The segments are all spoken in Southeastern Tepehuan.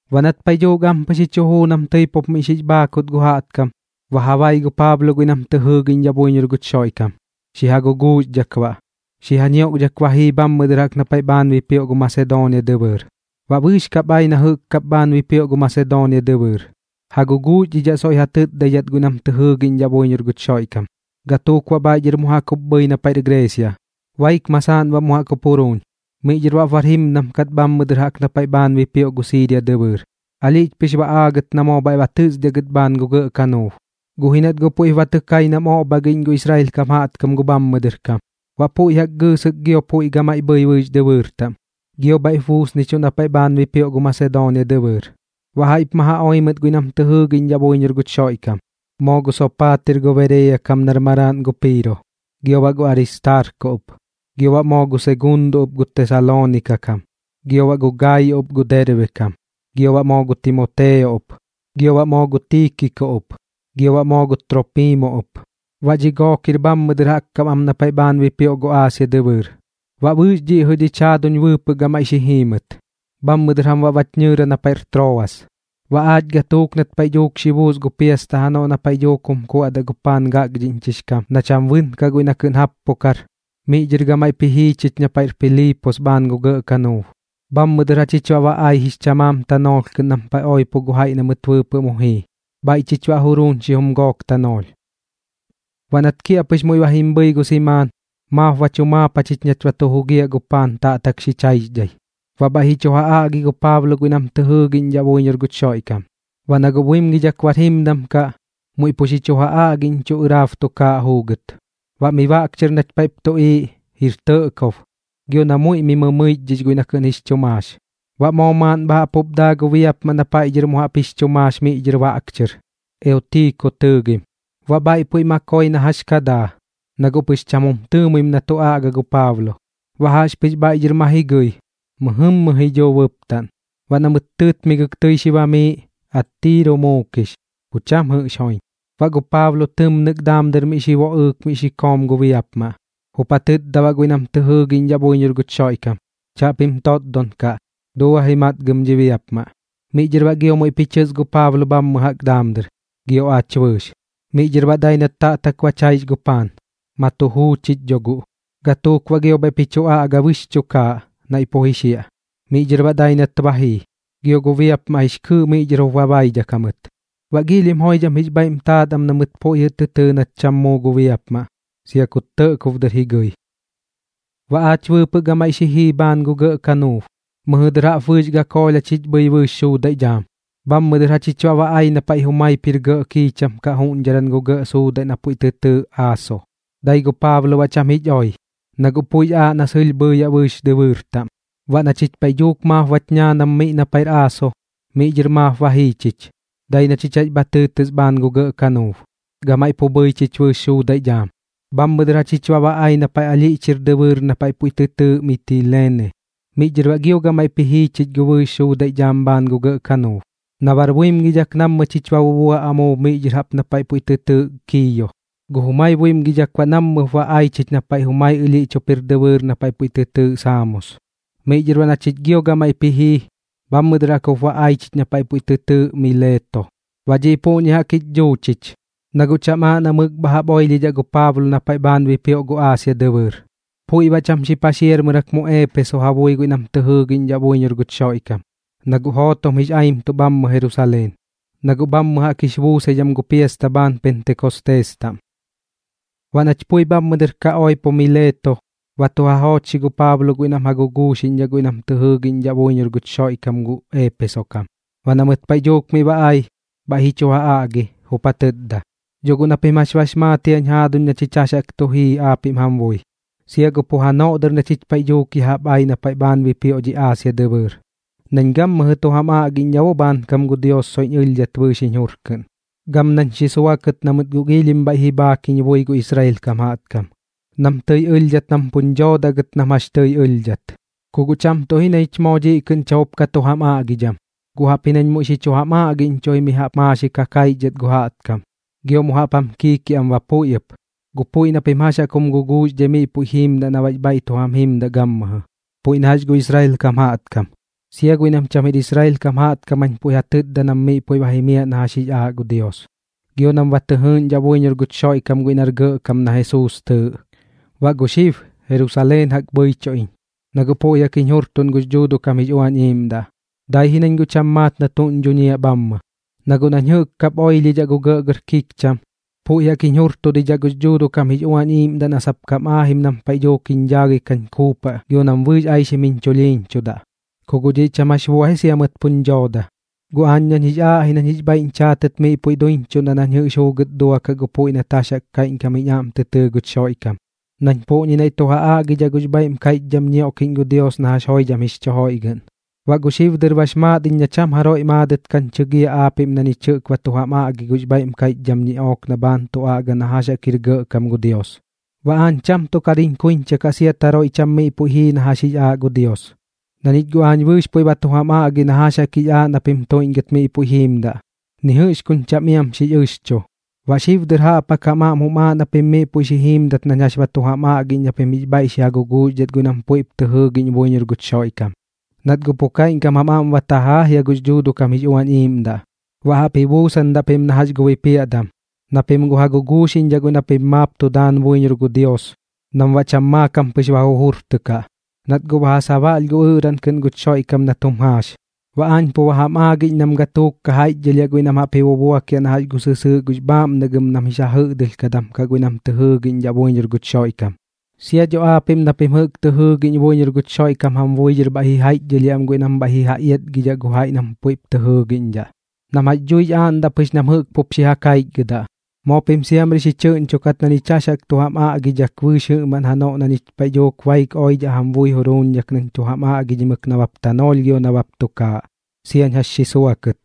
Baꞌ nat paiꞌ dhuuk ampɨx ji chu juu nam tɨi pup miꞌ xix bhaakut gu jaꞌtkam, ba ja bai gu Paablo guiꞌ nam tɨ jɨɨgiꞌñdhaꞌ buiñor guch Xoiꞌkam. Xi ja guguuxdhak baꞌ, xi ja ñioꞌkdhak ba jii bhammɨ dɨr jaꞌk na paiꞌ bhaan bipioꞌ gu Masedoonia dɨbɨɨr. Baꞌ bɨɨx kap ai na jɨꞌk kap bhaan bipioꞌ gu Masedoonia dɨbɨɨr, ja guguuxdhidhaꞌ soiꞌ ja tɨtdaidhat guiꞌ nam tɨ jɨɨgiꞌñdhaꞌ buiñor guch Xoiꞌkam. Gatuuk baꞌ bhaiꞌ dhɨr mu jaꞌk jup bhɨi na paiꞌr Greesia. Baik masaaꞌn baꞌ mu jaꞌk jup juruuñ, miꞌ dhɨr baꞌp bar jimdam kat bhammɨ dɨr jaꞌk na paiꞌ bhaan bipioꞌ gu Siiria dɨbɨɨr. Alhiꞌch pɨx ba aagɨt na moo bhaiꞌ ba tɨsdiaꞌ gɨt bhaan gu gɇꞌ kanuub, guꞌ ji nat guꞌ puiꞌp ba tɨ kai nam oꞌbhagiꞌñ gu Israel kam jaꞌtkam gu bhammɨ dɨr kam. Baꞌ puiꞌ jaꞌk gɨɨsɨk gio puiꞌ gamaiꞌ bhɨi bɨɨx dɨbɨɨr taꞌm, gio bhaiꞌp buusnichuꞌ na paiꞌ bhaan bipioꞌ gu Masedoonia dɨbɨɨr. Baꞌ jaiꞌp ma oi mɨt guiꞌ nam tɨ jɨɨgiꞌñdhaꞌ buiñor guch Xoiꞌkam, moo gu Soopatir gu Bereeya kam maraaꞌn gu Piiro, gio baꞌ gu Aristaarko ɨp, gio baꞌ moo gu Seguundo ɨp gu Tesaloonika kam, gio baꞌ gu Gaayo ɨp gu Derbe kam, gio baꞌ moo gu Timoteo ɨp. Gio baꞌ moo gu Tiikiko ɨp, gio baꞌ moo gu Troopimo ɨp, baꞌ dhi gook jir bhammɨ dɨr jaꞌk kam am na paiꞌ bhaan bipioꞌ gu Aasia dɨbɨɨr. Baꞌ bɨɨx dhiꞌ jɨꞌ dhich jaaduñ bɨɨpɨꞌ gamaiꞌ xi jii mɨt, bhammɨ dɨr jam baꞌ bach ñɨɨra na paiꞌr Troas. Baꞌ aach gatuuk nat paiꞌ dhuuk xi buus gu piasta janoꞌ na paiꞌ dhuuk jum kuaꞌdaꞌ gu paan gakdhiꞌñchix kam na cham bɨnkaꞌ guiꞌ na kɨꞌn jappukar, miꞌ dhɨr gamaiꞌp ji jii chich na paiꞌr Piliipos bhaan gu gɇꞌ kanuub. Bhammɨ dɨr jachich baꞌ ba ai jix chamaam tanoolh kɨꞌn nam paiꞌ oipo gu jaiꞌ na mɨt bɨɨpɨꞌ mu jii. Bhaiꞌ chich baꞌ juruuñ xijum gook tanoolh. Baꞌ nat kiaꞌpɨx muiꞌ ba jim bhɨi gu simaan, maap bach jumaap jachich nach ba tu jugiaꞌ gu paan taꞌtak xich jaixdhai, baꞌ bhaiꞌ ji chu ja aꞌgi gu Paablo guiꞌ nam tɨ jɨɨgiꞌñdhaꞌ buiñor guch Xoiꞌkam. Baꞌ na guꞌ buimgidhak bar jimdam kaꞌ, muiꞌ pu xi chu ja aꞌgiꞌñchuꞌ ɨraab tukaaꞌ juugɨt. Baꞌ miꞌ baꞌk chɨr nach paiꞌp tuꞌiiꞌ, jir tɇꞌkob, gio na muiꞌ mɨmɨichdhix guiꞌ na kɨꞌn jix chu maax. Baꞌ moo maaꞌn bha jaꞌp jup daa gu biapmaꞌ na paiꞌ dhɨr mu jaꞌp jix chu maax miꞌ dhɨr baꞌk chɨr, Eutiko tɨɨgim. Baꞌ bhaiꞌ puiꞌ ma koi na jax ka daa, na guꞌ pɨx cham jum tɨɨmuim na tu aꞌga gu Paablo. Baꞌ jaꞌxpɨx bhaiꞌ dhɨr ma ji gɨi, mɨjɨmmɨ ji dhuu bɨptaꞌn. Baꞌ na mɨt tɨɨtmigɨk tɨi xi bamiiꞌ, attiiro muukix, pu cham jɨꞌx joiñ. Baꞌ gu Paablo tɨmnɨk daam dɨr xi boꞌɨɨk miꞌ xi koom gu biapmaꞌ, jup ja tɨtda baꞌ guiꞌ nam tɨ jɨɨgiꞌñdhaꞌ buiñor guch Xoiꞌkam: ―Chaꞌpim totdon kaꞌ. Dua ji matgɨm dhi biapmaꞌ. Miꞌ dhɨr baꞌ gio muiꞌp ji chɨs gu Paablo bhammɨ jaꞌk daam dɨr, gio aach bɨɨx. Miꞌ dhɨr baꞌ dai nat taꞌtak bach jaix gu paan, ma tu juu chich dho guꞌ. Gatuuk baꞌ gio bhaiꞌp ji chu aꞌga bɨɨx chukaaꞌ, naiꞌ pu ji xiaꞌ. Miꞌ dhɨr baꞌ dai nat ba jii. Gio gu biapmaꞌ jix kɨɨꞌ miꞌ dhɨr jup ba baidhak jamɨt. Baꞌ giilhim joidham jix bhaiꞌm taat am na mɨt puiꞌ jɨꞌ tɨɨ nat cham muu gu biapmaꞌ, sia kut tɇꞌkob dɨr ji gɨi. Baꞌ aach bɨɨpɨꞌ gamaiꞌ xi jii bhaan gu gɇꞌ kanuub, mɨjɨ dɨr jaꞌp bɨɨx gakoolh jachich bhɨi bɨɨx suudaiꞌ dhaam. Bhammɨ dɨr jachich baꞌ ba ai na paiꞌ jumaip jir gɇꞌ kiicham kaꞌ juꞌñdharan gu gɇꞌ suudaiꞌ na puiꞌ tɨ tɨɨꞌ Aaso. Dai gu Paablo baꞌ cham jich oi, na guꞌ puiꞌx aaꞌ na sɨlh bhɨɨyaꞌ bɨɨx dɨbɨɨr taꞌm. Baꞌ na chich paiꞌ dhuuk maap bach ñaanam miꞌ na paiꞌr Aaso, miꞌ dhɨr maap ba jii chich, dai na chich jax bha tɨɨtɨs bhaan gu gɇꞌ kanuub, gamaiꞌ pu bhɨi chich bɨɨx suudaiꞌ dhaam. Bhammɨ dɨr jachich baꞌ ba ai na paiꞌ ɨlhiꞌch jir dɨbɨɨr na puiꞌ tɨ tɨɨꞌ Mitileene. Miꞌ dhɨr baꞌ gio gamaiꞌp ji jii chich gu bɨɨx suudaiꞌ dhaam bhaan gu gɇꞌ kanuub. Na bar buimgidhak nammɨ chich ba bubua amuub miꞌ dhɨr jaꞌp na paiꞌ puiꞌ tɨ tɨɨꞌ Kiiyo. Gu jumai buimgidhak baꞌ nammɨp ba ai chich na paiꞌ jumai ɨlhiꞌch jup jir dɨbɨɨr na puiꞌ tɨ tɨɨꞌ Saamos. Miꞌ dhɨr baꞌ na chich gio gamaiꞌp ji jii, bhammɨ dɨr jaꞌk jup ba ai chich na paiꞌ puiꞌ tɨ tɨɨꞌ Mileeto. Baꞌ dhiꞌ puꞌñi jaꞌk jich dhuu chich, na guꞌ cham aaꞌ na mɨk bha jaꞌp oilhidhaꞌ gu Paablo na paiꞌ bhaan bipioꞌ gu Aasia dɨbɨɨr. Puiꞌ baꞌ cham xi paxiarmɨrak mu Eepeso ja bui guiꞌ nam tɨ jɨɨgiꞌñdhaꞌ buiñor guch Xoiꞌkam, na guꞌ jootom jix aimtuꞌ bhammɨ Jerusaleen, na guꞌ bhammɨ jaꞌk jix buusaidham gu piasta bhaan Pentekostees taꞌm. Baꞌ nach pui bhammɨ dɨr ka oipo Mileeto, ba tu ja joochxi gu Paablo guiꞌ nam ja guguuxiꞌñdhaꞌ guiꞌ nam tɨ jɨɨgiꞌñdhaꞌ buiñor guch Xoiꞌkam gu Eepeso kam. Baꞌ na mɨt paiꞌ dhuuk miꞌ ba ai, bhaiꞌ ji chu ja aꞌgi, jup ja tɨtda: ―Dho guꞌ na pim jax bax maat jiañ jaaduñ na ñich jax jaꞌk tu jii aapiꞌm jam bui, sia gu pu janoꞌ dɨr na ñich paiꞌ dhuuk ya jaꞌp ai na paiꞌ bhaan bipioꞌ dhi Aasia dɨbɨɨr, nañ gammɨjɨ tu jam aꞌgiꞌñdhaꞌ bo bhaankam gu Dios soiꞌñ ɨlhdhat bɨɨx jiñ jur kɨꞌn, gam nañ xi suakɨt na mɨt guꞌ giilhim bhaiꞌ ji bhaak jiñ bui gu Israel kam jaꞌtkam, nam tɨi ɨlhdhat nam puñ dhoodaꞌ gɨt nam jax tɨi ɨlhdhat. Ku guꞌ cham tuꞌ ji na ñich moo dhiꞌ kɨꞌn cham jup ka tu jam aꞌgidham, guꞌ jaꞌpji nañ muiꞌ xi chu jam aꞌgiꞌñchuꞌ ji mi jaꞌp maaxik ja kaixdhat gu jaꞌtkam, gio mu jaꞌp jam kiikiaꞌam ba puiꞌ ɨp, gu puiꞌ na pim jax jaꞌk jum guguuxdhai miꞌ puiꞌ jiimdaꞌ na baꞌx bhaiꞌ tu jam jimdaꞌ gammɨjɨ. Puiꞌ na jax gu Israel kam jaꞌtkam, sia guiꞌ nam cham jir Israel kam jañ puiꞌ ja tɨtdadaꞌ nam miꞌ puiꞌ ba jimiaꞌ na jax jix aaꞌ gu Dios, gio nam ba tɨ jɨɨgiꞌñdhaꞌ buiñor guch Xoiꞌkam guiꞌ nar Gɇꞌkam na Jesuus tɨɨꞌ. Baꞌ gu xib, Jerusaleen jaꞌk bhɨichuꞌ iñ, na guꞌ puiꞌ jaꞌk jiñ jurtuꞌn gux Dhuuduꞌ kam jix Uañ Iiꞌmdaꞌ. Dai ji nañ guꞌ cham maat na tuꞌñ dhuñiaꞌ bhammɨ, na guꞌ nañ jɨꞌk kap oilhidhaꞌ gu gɇꞌgɇr kikcham, puiꞌ jaꞌk jiñ jurtudidhaꞌ gux Dhuuduꞌ kam jix Uañ Iiꞌmdaꞌ na sap kam aajim nam paiꞌ dhuuk jiñ dhaagɨi kañ kuupaꞌ gio nam bɨɨx aixim jiñ chulhiiñchudaꞌ. Ku guꞌ dhiꞌ cham jax bua ji sia mɨt puñ dhooda, guꞌ aañ nañ jix aaꞌ ji nañ jix bhaiꞌñ chaatɨt miꞌ puiꞌ duiñchuꞌndaꞌ nañ jɨꞌx juugɨt duakaꞌ gu puiꞌ nat jax jaꞌk kaiꞌñkam jiñ aꞌm tɨ tɨɨ guch Xoiꞌkam, nañ puꞌñi naiꞌ tu aꞌgidhaꞌ gux bhaiꞌm kaiꞌchdham ñioꞌkiꞌñ gu Dios na jax joidham jix chu joiꞌgɨꞌn. ’Baꞌ pu xib dɨr bax maat iñ na cham jaroiꞌ maadɨt kañ chɨgiaꞌ aapiꞌm na ñich jɨꞌk ba tu jam aꞌgi gux bhaiꞌm kaiꞌchdham ñiꞌook na bhaan tu aꞌga na jax jaꞌk jir gɇꞌkam gu Dios. Baꞌ aañ cham tuꞌ kar jiñ kuiñcha kaꞌ sia kut jaroiꞌ cham miꞌ puiꞌ jii na jax jix aaꞌ gu Dios, na ñich guꞌ aañ bɨɨx puiꞌ ba tu jam aꞌgi na jax jaꞌk jix aaꞌ na pim tuiꞌñgɨt miꞌ puiꞌ jiimdaꞌ, ni jɨꞌx kuñ cham iam xix ɨxchu. Baꞌ xib dɨr jaꞌp jaꞌk jam aꞌm jum aaꞌ na pim miꞌ puiꞌ xi jiimdat nañ jax ba tu jam aꞌgiꞌñ na pim jix bhaiꞌ xi ja guguuxdhat guiꞌ nam puiꞌp tɨ jɨɨgiꞌñ buiñor guch Xoiꞌkam, nat guꞌ pu kaiꞌñkam jam aꞌm bam tajaa jia gux Dhuuduꞌ kam jix Uañ Iiꞌmdaꞌ. Baꞌ jaꞌp ji buusandaꞌ pim na jax gu bipiaꞌdam, na pim guꞌ ja guguuxiꞌñdhaꞌ guiꞌ na pim maap tu daan buiñor gu Dios nam baꞌ cham maakam pɨx ba jujurtɨkaꞌ, nat guꞌ ba ja sabaꞌlh gu ɨꞌraꞌn kɨꞌn guch Xoiꞌkam nat jum jaax. Baꞌ aañ pu ba jam aagiꞌñ nam gatuuk ka jaiꞌchdhɨlhiaꞌ guiꞌ nam jaꞌp ji bubuakiaꞌ na jax gu sɨsɨɨꞌ gux bhaaꞌmnagɨm nam jix ja jɨꞌdɨlhkadam kaꞌ guiꞌ nam tɨ jɨɨgiꞌñdhaꞌ buiñor guch Xoiꞌkam. Sia dho aapiꞌm na pim jɨꞌk tɨ jɨɨgiꞌñ buiñor guch Xoiꞌkam jam bui dhɨr jaiꞌchdhɨlhiaꞌ am guiꞌ nam bhaiꞌ ji ja iatgidhaꞌ gu jaiꞌ nam puiꞌp tɨ jɨɨgiꞌñdhaꞌ, nam jax dhuix aaꞌndaꞌ pɨx nam jɨꞌk jup xi ja kaichgɨdaꞌ. Moo pim siamri xi chɨꞌñchukat na ñich jax jaꞌk jam aaꞌñdhak bɨɨx jɨꞌmaꞌn janoꞌ na ñich paiꞌ dhuuk baik oidhaꞌ jam bui juruuñdhak nañ tu jam aꞌgidhimɨk nabap tanoolh gio nabap tukaaꞌ, siañ jax xi suakɨt.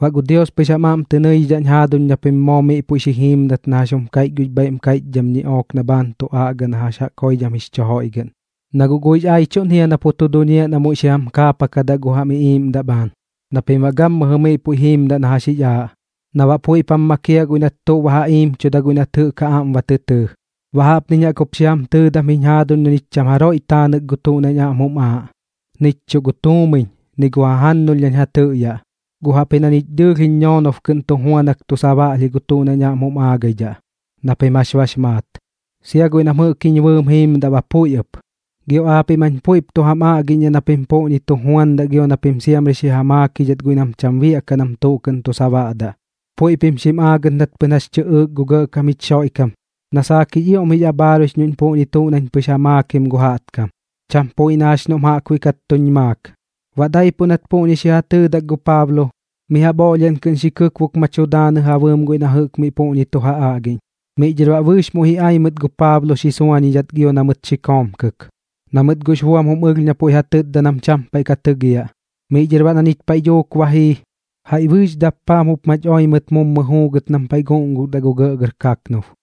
’Baꞌ gu Dios pɨx jam aꞌm tɨ nɨiꞌñdhaꞌñ jaaduñ na pim moo miꞌ puiꞌ xi jiimdat na jax jum kaiꞌch gux bhaiꞌm kaiꞌchdham ñiꞌook na bhaan tu aꞌga na jax jaꞌk joidham jix chu joiꞌgɨꞌn. Na guꞌ guiꞌx aiꞌchuꞌn jia na pu tu duñiaꞌ na muiꞌ xi jam kaapakadaꞌ gu jam iꞌiiꞌmdaꞌ bhaan na pim baꞌ gammɨjɨ miꞌ puiꞌ jiimdaꞌ na jax jix aaꞌ, na baꞌ puiꞌp jam makiaꞌ guiꞌ nat tuꞌ ba ja iimchuda guiꞌ nat jɨꞌk ja aꞌm ba tɨ tɨɨ. Baꞌ jaꞌpniñ jaꞌk jup xi jam tɨɨdam jiñ jaaduñ na ñich cham jaroiꞌ taanɨk gu tuꞌ nañ aꞌm jum aaꞌ, nich chuꞌ tuumiñ ni gu jajannulh nañ ja tɨꞌyaꞌ. Guꞌ jaꞌpji na ñich dɨɨlh jiñ ñoonob kɨꞌn tu juanak tu sabaꞌlh gu tuꞌ nañ aꞌm jum aagaidhaꞌ, na pim jax bax maat, sia guiꞌ nam jɨꞌk jiñ bɨɨm jiimdaꞌ ba puiꞌ ɨp. Gio aapiꞌm jañ bɨɨx puiꞌp tu jam aꞌgiꞌñdhaꞌ na pim puꞌñi tu juandaꞌ gio na pim siamri xi ja maakidhat guiꞌ nam cham biaꞌkaꞌ nam tuꞌ kɨꞌn tu sabaꞌdaꞌ, puiꞌ pim xim aagɨt nat pɨn jax tɨꞌɨɨk gu Gɇꞌkam jich Xoiꞌkam na saak jix ioꞌm jix abhaaruix noꞌñ puꞌñi tuꞌ nañ pɨx ja maakim gu jaꞌtkam, cham puiꞌ na jax noꞌm jaꞌkbuiꞌ kat tuñ maak. Baꞌ daipuꞌ nat puꞌñi xi ja tɨɨdak gu Paablo, mi jaꞌp oꞌlhiaꞌn kɨꞌn xi kɨkbok ma tu daanɨ ja bɨɨm guiꞌ nam jɨꞌk miꞌ puꞌñi tu ja aꞌgiꞌñ. Miꞌ dhɨr baꞌ bɨɨx muiꞌ ji ai mɨt gu Paablo xi suañidhat gio na mɨt xi koomkɨk, na mɨt guꞌx buam jim ɨlh na puiꞌ ja tɨtda nam cham paiꞌ ka tɨgiaꞌ. Miꞌ dhɨr baꞌ na chich paiꞌ dhuuk ba jii, jaiꞌ bɨɨx dappaam jup mach oi mɨt mummɨ juugɨt nam paiꞌ guꞌngukdaꞌ gu gɇꞌgɇr kaknub.